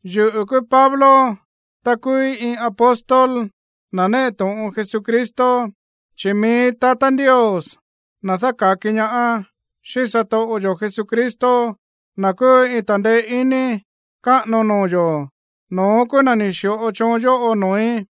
Yuꞌu̱ kúú Pablo, ta kúúí iin apóstol, na̱ néꞌe to̱ꞌon Jesucristo, chi̱ mií tatá Ndios, na̱ dáka̱ki ñaá, xíꞌín satoꞌo yo̱ Jesucristo, na̱ kúú iin ta̱ndeé iní káꞌano noo̱ yo̱, no̱ón kúú na̱ ni̱ xi̱ꞌo choon yóꞌo noo̱í.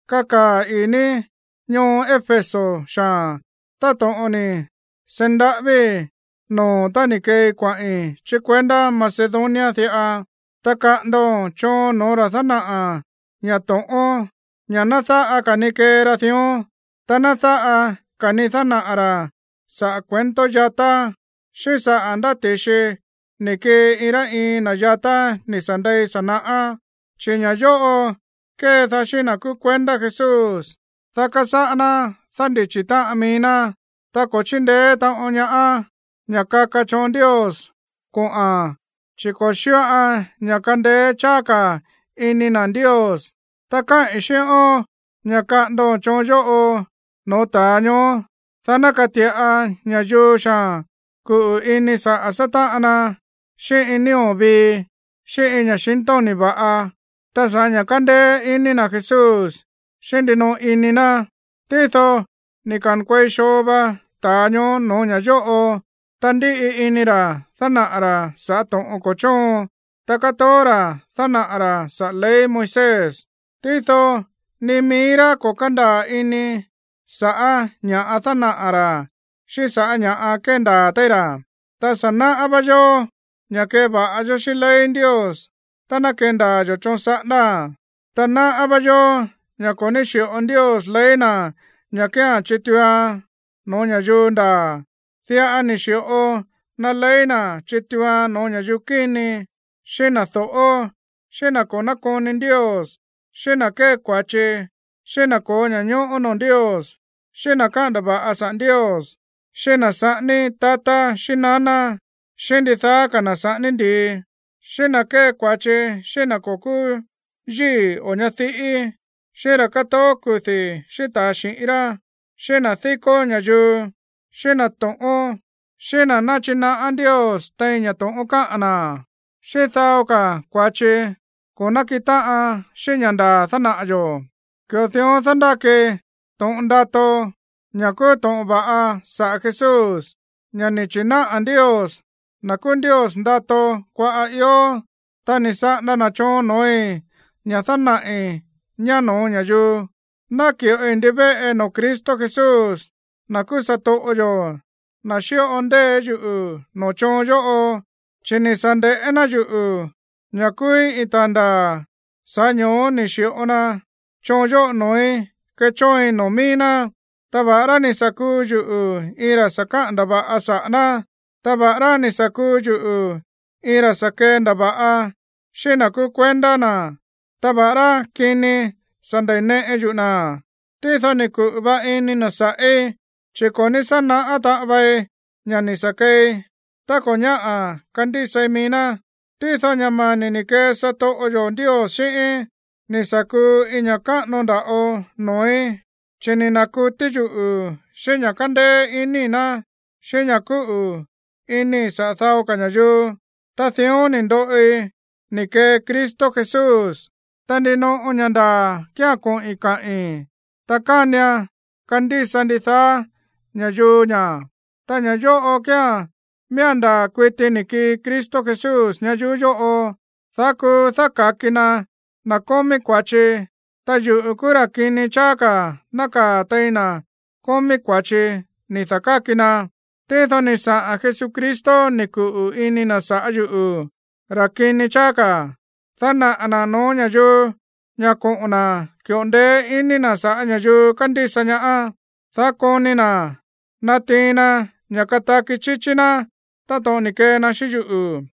Kakaa̱ ii̱ ní ñoo Éfeso xaa̱n, táto̱ꞌon ni̱ seí ndaꞌávíi̱ noo̱o̱n tá ni̱ keei kuaꞌi̱n chí kuendá Macedonia diꞌa, ta kaꞌa̱ndo̱n choon noo̱ ra̱ dánaꞌa̱ ña̱ to̱ꞌón ña̱ ná dáꞌa ka̱ ni kee ra dión, ta ná dáꞌa ka̱ ni dánaꞌa̱ ra̱ sa̱ꞌá cuento yatá, xíꞌín saꞌa̱ ndá ti̱xi ni̱ kii iin rá iin na̱ yatá ni̱ sa̱ ndei sa̱ naꞌá. Chi̱ ña̱ yóꞌo kédaá xíꞌín na̱ kúú kuendá Jesús, dá kasáꞌá ná dándichi̱ táꞌan mií ná, ta ko̱ chíndeé taꞌon ñaá ña̱ kaka choon Ndios kuaꞌa̱n, chi̱ ko̱ xíꞌoan ña̱ kandeé cháá ka̱ ini na̱ Ndios. Ta káꞌi̱n xíꞌón ña̱ kaꞌa̱ndo̱n choon yóꞌo noo̱ ta̱a ñoó, dá ná kati̱ꞌa ña̱yuu xaa̱n kuꞌu̱ ini saꞌa̱ sátáꞌan na xíꞌín iin nío̱ vii, xíꞌín iin ña̱xintóni̱ va̱ꞌa, ta sa̱ꞌá ña̱ kándéé iní na̱ Jesús xíꞌín ndinoꞌo ini na̱. Tído ni̱ ka̱nkuei xoo va ta̱a ñoó no̱ó ña̱ yóꞌo, ta ndíꞌi ini ra̱ dánaꞌa̱ ra̱ saꞌa̱ to̱ꞌon ko̱ chóon. Ta kátoó ra̱ dánaꞌa̱ ra̱ saꞌa̱ ley Moisés, tído ni mií rá ko̱ kándaa̱ ini sa̱ꞌá ña̱ dánaꞌa̱ ra̱ xíꞌín sa̱ꞌá ña̱ kéndaa̱ téí ra̱. Ta sa̱ náꞌá vá yó ña̱ keva̱ꞌa yó xíꞌín ley Ndios tá ná kendaa̱ yo̱ choon saꞌándáa̱n. Ta náꞌá vá yó ña̱ ko̱ ní xi̱ꞌo Ndios ley na̱ ña̱ kía̱n chituuan no̱ó ña̱yuu ndaa̱. Diꞌa ni̱ xi̱ꞌo na ley na̱ chituuan no̱ó ña̱yuu kíni, xíꞌín na̱ do̱ꞌó, xíꞌín na̱ ko̱ nákoni Ndios, xíꞌín na̱ kée kua̱chi, xíꞌín na̱ ko̱ó ña̱ñóꞌó noo̱ Ndios, xíꞌín na̱ káꞌa̱n ndava̱ꞌa saꞌa̱ Ndios, xíꞌín na̱ saꞌání tatá xíꞌín naná, xíꞌín ndidaá ka̱ na̱ saꞌání ndi̱i, xíꞌín na̱ kée kua̱chi xíꞌín na̱ ko̱ kúú yíi̱ o ñadiꞌí, xíꞌín ra̱ kátoó kudi̱ xíꞌín ta̱a xi̱ꞌín rá, xíꞌín na̱ díkó ña̱yuu, xíꞌín na̱ to̱ꞌón, xíꞌín na̱ náchinaꞌá Ndios tein ña̱ to̱ꞌón káꞌa̱n na̱, xíꞌín dao ka̱ kua̱chi ko̱ nákiꞌin táꞌan xíꞌín ña̱ ndaa̱ dánaꞌa̱ yo̱. Ki̱ꞌo dión dándáki to̱ꞌon ndato, ña̱ kúú to̱ꞌon va̱ꞌa saꞌa̱ Jesús, ña̱ ni̱ chi̱náꞌa̱ Ndios, na̱ kúú Ndios ndato kuaꞌa̱ ió. Ta ni̱ saꞌanda na̱ choon noo̱í ña̱ dánaꞌi̱ ñá no̱ó ña̱yuu. Náki̱ꞌoi ndivéꞌe noo̱ Cristo Jesús, na̱ kúú satoꞌo yo̱, na̱ xíꞌo ndeé yuꞌu̱ noo̱ choon yóꞌo. Chi̱ ni̱ sa̱ nde̱ꞌé ná yuꞌu̱ ña̱ kúúí iin ta̱a ndaa̱, sa̱ꞌá ño̱ó ni̱ xi̱ꞌo na choon yóꞌo noo̱í kechóoin noo̱ mií ná. Ta va̱ꞌará ni̱ sa̱ kuu yuꞌu̱ iin ra̱ sa̱ kaꞌa̱n ndava̱ꞌa saꞌa̱ ná, ta va̱ꞌará ni̱ sa̱ kuu yuꞌu̱ iin ra̱ sa̱ kendava̱ꞌa xíꞌín na̱ kúú kuendá na̱, ta va̱ꞌará kini sa̱ nda̱neꞌe yuꞌu̱ na̱, tído ni̱ kuꞌu̱ va ini na̱ sa̱ꞌí, chi̱ ko̱ ní sá naꞌá taꞌan vei ña̱ ni̱ sa̱ keei, ta ko̱ ñáꞌa̱ kandísai mií ná. Tído ña̱ mani̱ ni̱ kee satoꞌo yo̱ Ndios xíꞌíín ni̱ sa̱ kuu iin ña̱ káꞌano nda̱ꞌo noo̱í, chi̱ ni̱ na̱kutí yuꞌu̱ xíꞌín ña̱ kándéé iníi̱ ná, xíꞌín ña̱ kúꞌu̱ inii̱ saꞌa̱ dao ka̱ ña̱yuu. Ta dión ni̱ ndoꞌi ni̱ kee Cristo Jesús. Ta ndinoꞌo ña̱ ndaa̱ kía̱n koꞌi̱n kaꞌi̱n, ta kánian kandísa ndidaá ña̱yuu ña̱. Ta ña̱ yóꞌo kíán: miía̱n ndaa̱ kuiti ni̱ kii Cristo Jesús ñayuú yóꞌo, dá kuu dáka̱ki na na̱ kómí kua̱chi, ta yuꞌu̱ kúú ra̱ kini cháá ka̱ nákaa̱ tein na̱ kómí kua̱chi ni̱ da̱káki na. Tído ni̱ saꞌa̱n Jesucristo ni̱ kuꞌu̱ ini na̱ sa̱ꞌá yuꞌu̱, ra̱ kini cháá ka̱, dá dánaꞌa̱ na̱ no̱ó ña̱yuu ña̱ koꞌo̱n na̱ ki̱ꞌo ndeé iní na̱ sa̱ꞌá ña̱yuu kándísa ñaá, dá koni na̱ natiin na ña̱ kataki chíchí ná táto̱ꞌon ni̱ kee na xíꞌín yuꞌu̱.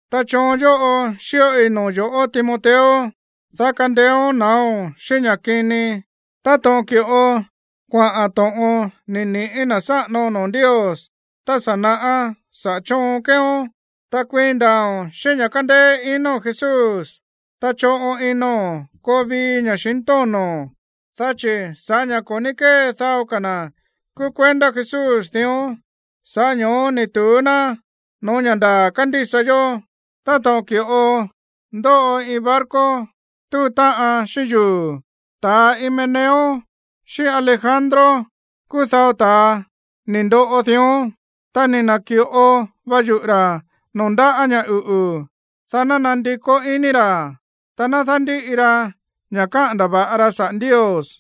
Ta choon yóꞌo xíꞌoi noo̱ yo̱ꞌó, Timoteo, dá kandeéón na̱áo̱n xíꞌín ña̱ kini, táto̱ꞌon ki̱ꞌo kuaꞌa̱n to̱ꞌon ni̱ niꞌi̱ na̱ sáꞌano noo̱ Ndios tá sa̱ naꞌá saꞌa̱ choon keeón. Ta kuiin ndaa̱o̱n xíꞌín ña̱ kándéé ino̱n Jesús, ta choꞌon ino̱n koo vii ña̱xintóno̱n, dá chi̱ sa̱ꞌá ña̱ ko̱ ní kée dao ka̱ na̱ kúú kuendá Jesús dión, sa̱ꞌá ño̱ó ni̱ tu̱ú ná no̱ó ña̱ ndaa̱ kándísa yó, táto̱ꞌon ki̱ꞌo ndóꞌo iin barco túu táꞌan xíꞌín yuu̱. Ta Himeneo xíꞌín Alejandro kúú dao ta̱a ni̱ ndoꞌo dión, ta ni̱ na̱ki̱ꞌo va yuꞌu̱ ra̱ noo̱ ndáꞌa̱ ña̱ uꞌu̱, dá ná nandikó iní ra̱, ta ná dándíꞌi ra ña̱ káꞌa̱n ndava̱ꞌa ra saꞌa̱ Ndios.